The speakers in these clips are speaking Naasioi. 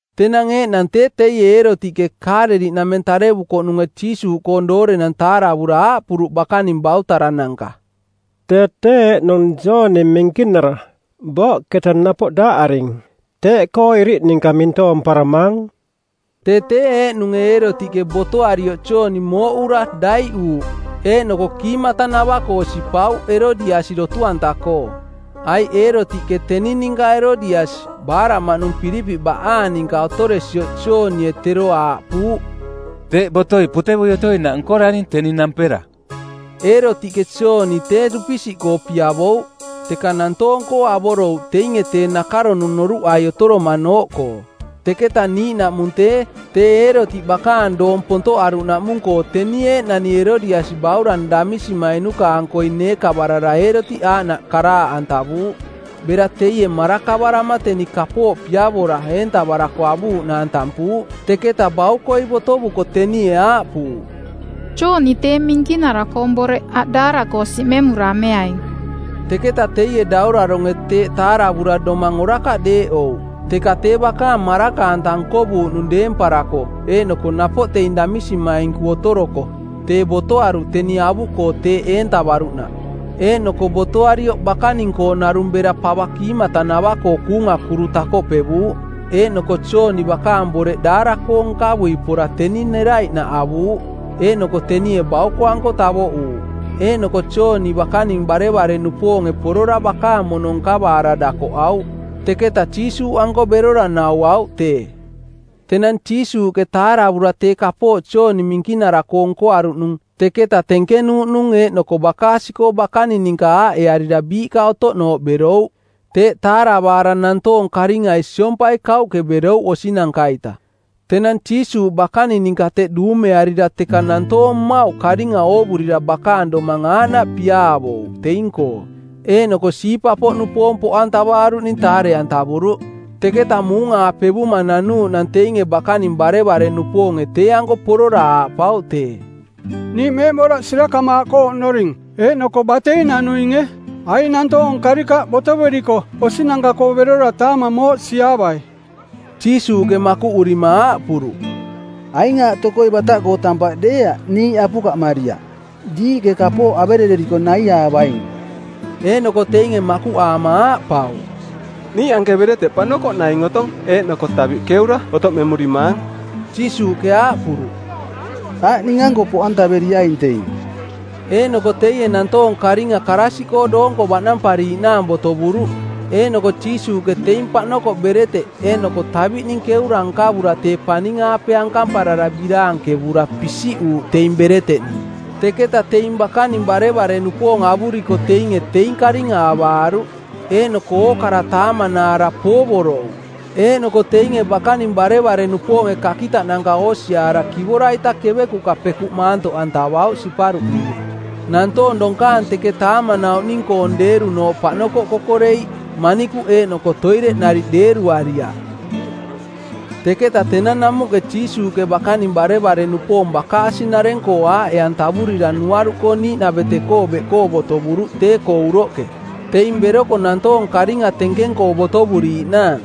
Tenang eeꞌnang tee teie Eerotiꞌke, Kaaleliꞌnameng tarevukoꞌnunge Jiisuuꞌkoong doorenang taaravura aaꞌpuruꞌ bakaning bautarananka, “Tee tee eeꞌnung Jooni Minkinara; booꞌketa napoꞌ daaꞌaring. Teeꞌkoo iriꞌ ninka mintoomparamaang.” Tee tee eeꞌnunge Eerotiꞌke botoarioꞌ Jooni mooꞌura, daiꞌuuꞌ, eeꞌnoko kiimatanava-koo sipauꞌ Erodiasi dotu-anta-koo; Aiꞌ Eerotiꞌke teni ninka Erodiasi, baaraꞌmaꞌnung Pilipiꞌ baꞌaang ninka otoresioꞌ Joonie tero aaꞌpuuꞌ, “Teeꞌ botoi potevui otoinaꞌ nkoraring teni nampera.” Eerotiꞌke Jooni tee dupisiꞌkoo piavouꞌ, teka nantoong-koo avorouꞌ teinge tee nakaronung noruꞌai otoromanooꞌkoo. Teketa niiꞌnaꞌmung tee, tee Eerotiꞌ bakaang doong pontoꞌaruꞌnaꞌmung-koo teni eeꞌnani Erodiasi baurang damisimainku-ankoi neekavarara Eerotiꞌ aaꞌnaꞌ karaaꞌantavuuꞌ. Bera teie marakavarama teni kapooꞌ piavora eentavarako avuuꞌnaang tampuuꞌ. Teketa baukoi botovuko tenie aaꞌpuuꞌ, “Jooni tee Minkinara-koong boreꞌ aꞌ daara-koo siꞌmemura ameaing.” Teketa teie dauraronge˜ teeꞌ taaravura domang orakaꞌ deeꞌouꞌ, teka tee bakaang maraka-anta nkovuuꞌnung deemparako eeꞌnoko napoꞌ teing damisimainku otoroko, tee botoaruꞌ teni avuꞌkoo teeꞌ eentavaruꞌnaꞌ. Eeꞌnoko botoarioꞌ bakaning-koo narung bera pava kiimatanavaꞌkoo kuunga kuru takoꞌpevuuꞌ. Eeꞌnoko Jooni bakaang boreꞌ daara-koo nkavui pora teni neraiꞌnaꞌ avuuꞌ. Eeꞌnoko tenie bauko-anko tavoꞌuuꞌ. Eeꞌnoko Jooni bakaning barevare-nupoonge porora bakaang mono nkavaara dakoꞌauꞌ. Teketa Jiisuuꞌanko berora nauauꞌ tee. Tenang Jiisuuꞌke taaravura tee kapooꞌ Jooni Minkinara-koo nkoaruꞌnung, teketa tenkenuuꞌnung eeꞌnoko bakaasi-koo bakaning ninka aaꞌearira biiꞌka otoꞌnooꞌ berouꞌ. Teeꞌ taaravaara nantoong karingai siompai kauꞌke berouꞌ osinanka-ita. Tenang Jiisuuꞌ bakaning ninka teꞌ duumearira˜ teka nantoonanka mmauꞌ karinga oovurira bakaang domang aaꞌnaꞌ piaavouꞌ teing-koo, eeꞌnoko siipa-nupoong poꞌantavaaruꞌning taare-antavuruꞌ. Teketa muung-aapevuma nanuuꞌnang teinge bakaning barevare-nupoonge tee-anko porora aaꞌpauꞌ tee, “Niiꞌ meeꞌboraꞌ sirakamaaꞌkoo oꞌnoring eeꞌnoko batei nanuinge. Aing nantoong karikaꞌ botoveriko osinanka-koo berora taamang mooꞌsiiaavai.” Jiisuuꞌke makuꞌurima aaꞌpuruꞌ, “Aing aaꞌ tokoi bataꞌkoo tampaꞌ deeaꞌ niiꞌ apukaꞌmariaꞌ. Diiꞌke kapooꞌ averereriko naiaavaing.” Eeꞌnoko teinge makuꞌaama aaꞌpauꞌ, “Niiꞌ anke bereteꞌ paꞌnokoꞌ naing otong eeꞌnoko taviꞌ keura otoꞌmemurimaang.” Jiisuuꞌke aaꞌpuruꞌ, “Aꞌ ning-anko poꞌantaveriaing teing.” Eeꞌnoko teie nantoong karinga karaasiꞌkoo doonko baꞌnampariiꞌnaang botovuruꞌ. Eeꞌnoko Jiisuuꞌke teing paꞌnokoꞌ bereteꞌ eeꞌnoko taviꞌning keura nkavura tee paning-aape ankamparara biraankevura pisiꞌuuꞌ teing bereteꞌning. Teketa teing bakaning barevare-nupoong avuriko teinge teing karinga avaaruꞌ. Eeꞌnoko ookara taamanaara poovorouꞌ. Eeꞌnoko teinge bakaning barevare-nupoonge kakitaꞌnanka oosiaara kivora-ita kevekuꞌka pekuꞌ maantoꞌantavauꞌ siparuꞌninge. Nantoong donkaang teke taamanauꞌning-koong deerunooꞌ paꞌnokoꞌ kokoreiꞌ, manikuꞌ eeꞌnoko toireꞌ nariꞌ deeruariaꞌ. Teketa tenang namuꞌke Jiisuuꞌke bakaning barevare-nupoong bakaasi-nareng-koo aaꞌe-antavurira nuaruꞌkoo niiꞌnavete-koo beꞌkoo botovuruꞌ tee-koo uroꞌke, teing beroko nantoong karinga tenkeng-koo botovuriiꞌnaang.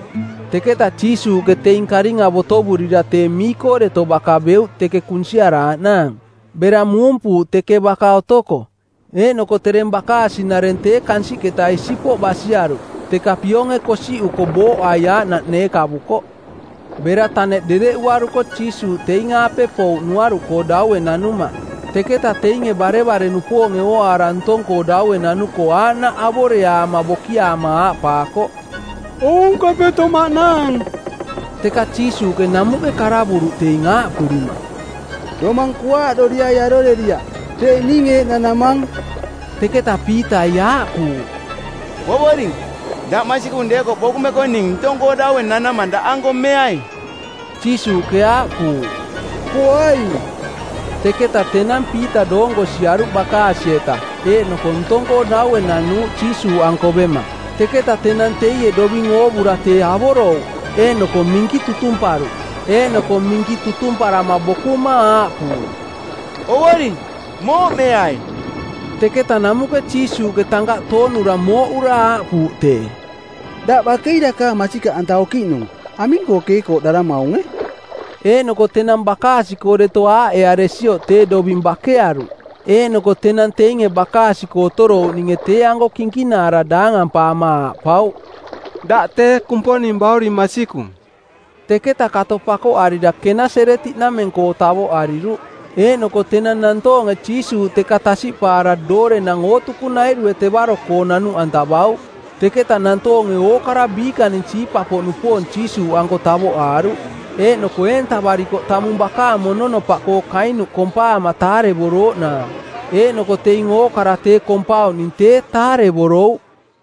Teketa Jiisuuꞌke teing karinga botovurira tee mii-koo deto baka beuꞌ teke kunsiaraaꞌnaang, bera muumpuuꞌ teke baka otoko. Eeꞌnoko tereng bakaasi-nareng tee kansiꞌketa isipoꞌ basiaruꞌ, teka pionge kosiꞌuko booꞌai aaꞌnaꞌ neekavukoꞌ. Bera taneꞌ dereꞌuaruko Jiisuuꞌ teing-aape pouꞌ nuaruꞌkoo daue nanuma. Teketa teinge barevare-nupoonge ooaara ntong-koo daue nanuko, aaꞌnaꞌ avoreaama bokiaama aaꞌpaakoꞌ, “Aunkapeto maꞌnaang!” Teka Jiisuuꞌke namuꞌke karavuruꞌ teing, aaꞌpurima, “Domang kuaaꞌdoriai aroreriaꞌ, tee ning eeꞌ nanamang.” Teketa Piitai aaꞌpuuꞌ, “Ovoring, daꞌ masikung deekoꞌ bokumeko ning ntong-koo daue nanama daꞌanko meai.” Jiisuuꞌke aaꞌpuuꞌ, “Poaing.” Teketa tenang Piita doonko siaruꞌ bakaasi-eta, eeꞌnoko ntong-koo daue nanuuꞌ Jiisuuꞌanko bema. Teka tenang teie doving oovura tee avorouꞌ, eeꞌnoko minki tutumparuꞌ, eeꞌnoko minki tutumparama bokuma aaꞌpuuꞌ, “Ovoring, mooꞌmeai!” Teketa namuꞌke Jiisuuꞌke tankaꞌ toonura mooꞌura aaꞌpuuꞌ tee, “Daꞌ bakei dakaang masikaꞌanta okiꞌnung. Aming-koo keekooꞌdaramaunge?” Eeꞌnoko tenang bakaasi-koo deto aaꞌearesioꞌ tee doving bakearuꞌ. Eeꞌnoko tenang teinge bakaasi-koo otorouꞌninge tee-anko kinkinaara daangampaama aaꞌpauꞌ, “Daꞌ tee Kumponing bauring masikung!” Teketa kato pakoꞌarira Kenaseretiꞌnameng-koo tavoꞌariruꞌ. Eeꞌnoko tenang nantoonge Jiisuuꞌ teka tasiꞌpaara doorenang ootukunairue tevaro-koo nanuꞌantavauꞌ. Teketa nantoonge ookara biikaning siipa-poꞌnupoong Jiisuuꞌanko tavoꞌaaruꞌ. Eeꞌnoko eentavarikoꞌ tamung bakaang mononopaꞌkoo kainuꞌ kompaama taarevorooꞌnaang. Eeꞌnoko teing ookara tee kompauꞌning tee taarevorouꞌ.